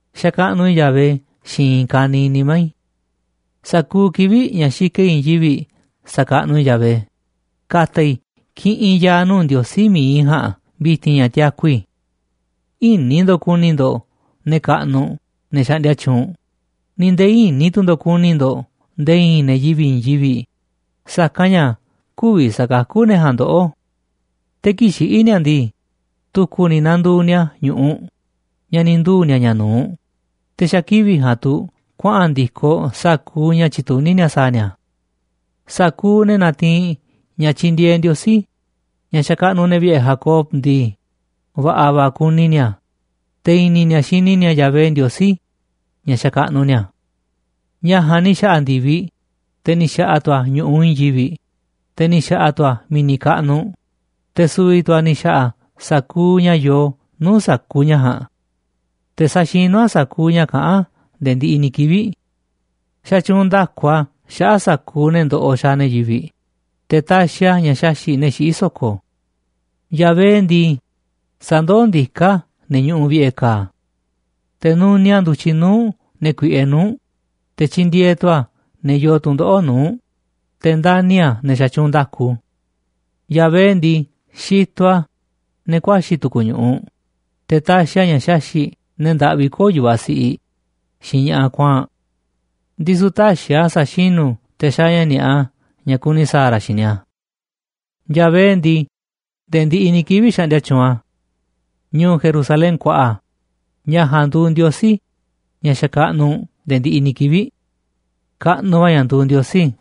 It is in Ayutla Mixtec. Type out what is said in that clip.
Xakaꞌnuꞌ i̱ Yahvé xiinꞌ i̱i̱n ka̱niiꞌ nimá i̱. Sa̱kuuꞌ kivi̱ꞌ ña̱ xikaꞌ i̱ i̱i̱n yivi̱ꞌ sa̱kaꞌnuꞌ i̱ Yahvé, ka̱ta̱ i̱ kiꞌinꞌ ya̱a̱ nuu̱ꞌ Ndiosí mi̱iꞌ i̱ ja̱a̱nꞌ vi̱ti̱n ña̱ tiaku i̱. Ï̱ni̱ ndo̱ꞌ ku̱ni̱ ndo̱ꞌ ne̱ kaꞌnuꞌ, ne̱ xaꞌndia tyuunꞌ, ni̱ nde̱e̱ ï̱ni̱ tu̱ ndo̱ꞌ ku̱ni̱ ndo̱ꞌ nde̱e̱ i̱i̱n ne̱ yivi̱ꞌ i̱i̱n yivi̱ꞌ, sa̱kanꞌ ña̱ kü̱vi̱ sa̱kakú ne̱ ja̱a̱nꞌ ndoꞌó. Te̱ kii̱ꞌ xiꞌí ni̱a̱ ndii, tu̱ku̱ ni̱ nanduuꞌ ni̱a̱ ñu̱ꞌuꞌ ña̱ ni̱ nduu̱ ni̱a̱ ña̱ nu̱uꞌ, te̱ xa̱ kivi̱ꞌ ja̱a̱nꞌ tu̱ kuaꞌa̱n ndi̱koꞌ sa̱kuuꞌ ña̱ tyituní ni̱a̱ sa̱a̱ ni̱a̱. Sa̱kuuꞌ ne̱ natiinꞌ ña̱ tyindieeꞌ Ndiosí, ña̱ xakaꞌnuꞌ ne̱ vi̱ꞌe̱ Jacob ndii, va̱ꞌa̱ va̱ kuni ni̱a̱, te̱ i̱ni̱ ni̱a̱ xini ni̱a̱ Yahvé Ndiosí ña̱ xakaꞌnuꞌ ni̱a̱. Ña̱ ja̱a̱nꞌ ni̱ xa̱ꞌa̱ ndi̱viꞌ, te̱ ni̱ xa̱ꞌa̱ tu̱ a̱ ñu̱ꞌuꞌ i̱i̱n yivi̱ꞌ, te̱ ni̱ xa̱ꞌa̱ tu̱ a̱ mi̱ni̱ kaꞌnuꞌ, te̱ su̱vi̱ tu̱ a̱ ni̱ xa̱ꞌa̱ sa̱kuuꞌ ña̱ yoo nuu̱ꞌ sa̱kuuꞌ ña̱ ja̱a̱nꞌ. Te̱ saxinú a̱ sa̱kuuꞌ ña̱ kaꞌán a̱ nde̱e̱ ndiꞌiꞌ ni̱ kivi̱ꞌ. Xatyuunꞌ nda̱ku a̱ xaꞌa̱ꞌ sa̱kuuꞌ ne̱ ndoꞌoꞌ xaaꞌ ne̱ yivi̱ꞌ, te̱ taxiꞌ a̱ ña̱ xaxi̱ꞌ ne̱ xiꞌí so̱ko̱. Yahvé ndii, sandoó ndiká a̱ ne̱ ñuꞌuꞌ vi̱ꞌe̱ ka̱a̱. Te̱ nuniaꞌ a̱ ndu̱tyiꞌ nuu̱ꞌ ne̱ kuiꞌe nuu̱ꞌ, te̱ tyindieeꞌ tu̱ a̱ ne̱ yoo tu̱ndoꞌo̱ꞌ nuu̱ꞌ, te̱ ndani̱ a̱ ne̱ xatyuunꞌ nda̱ku. Yahvé ndii, xitoꞌ a̱ ne̱ ku̱a̱xi̱ tu̱ku̱ ñu̱ꞌuꞌ, te̱ taxiꞌ a̱ ña̱ xaxi̱ꞌ ne̱ ndaꞌvi kö̱o̱ yu̱vaꞌ siꞌiꞌ xiinꞌ ña̱ꞌaꞌ kuaa̱nꞌ. Ndisu̱ tä̱xi̱ a̱ sa̱xinú te̱ xaaꞌ ña̱ ni̱a̱ꞌa ña̱ kuni sa̱a̱ ra̱ xiinꞌ ni̱a̱. Yahvé ndii, nde̱e̱ ndiꞌiꞌ ni̱ kivi̱ꞌ xaꞌndia tyuunꞌ a̱. Ñu̱u̱ Jerusalén kuaꞌa, ña̱ ja̱a̱nꞌ nduuꞌ Ndiosí ña̱ xakaꞌnuꞌ u̱nꞌ nde̱e̱ ndiꞌiꞌ ni̱ kivi̱ꞌ. ¡Kaꞌnuꞌ va̱ ña̱ nduuꞌ Ndiosí!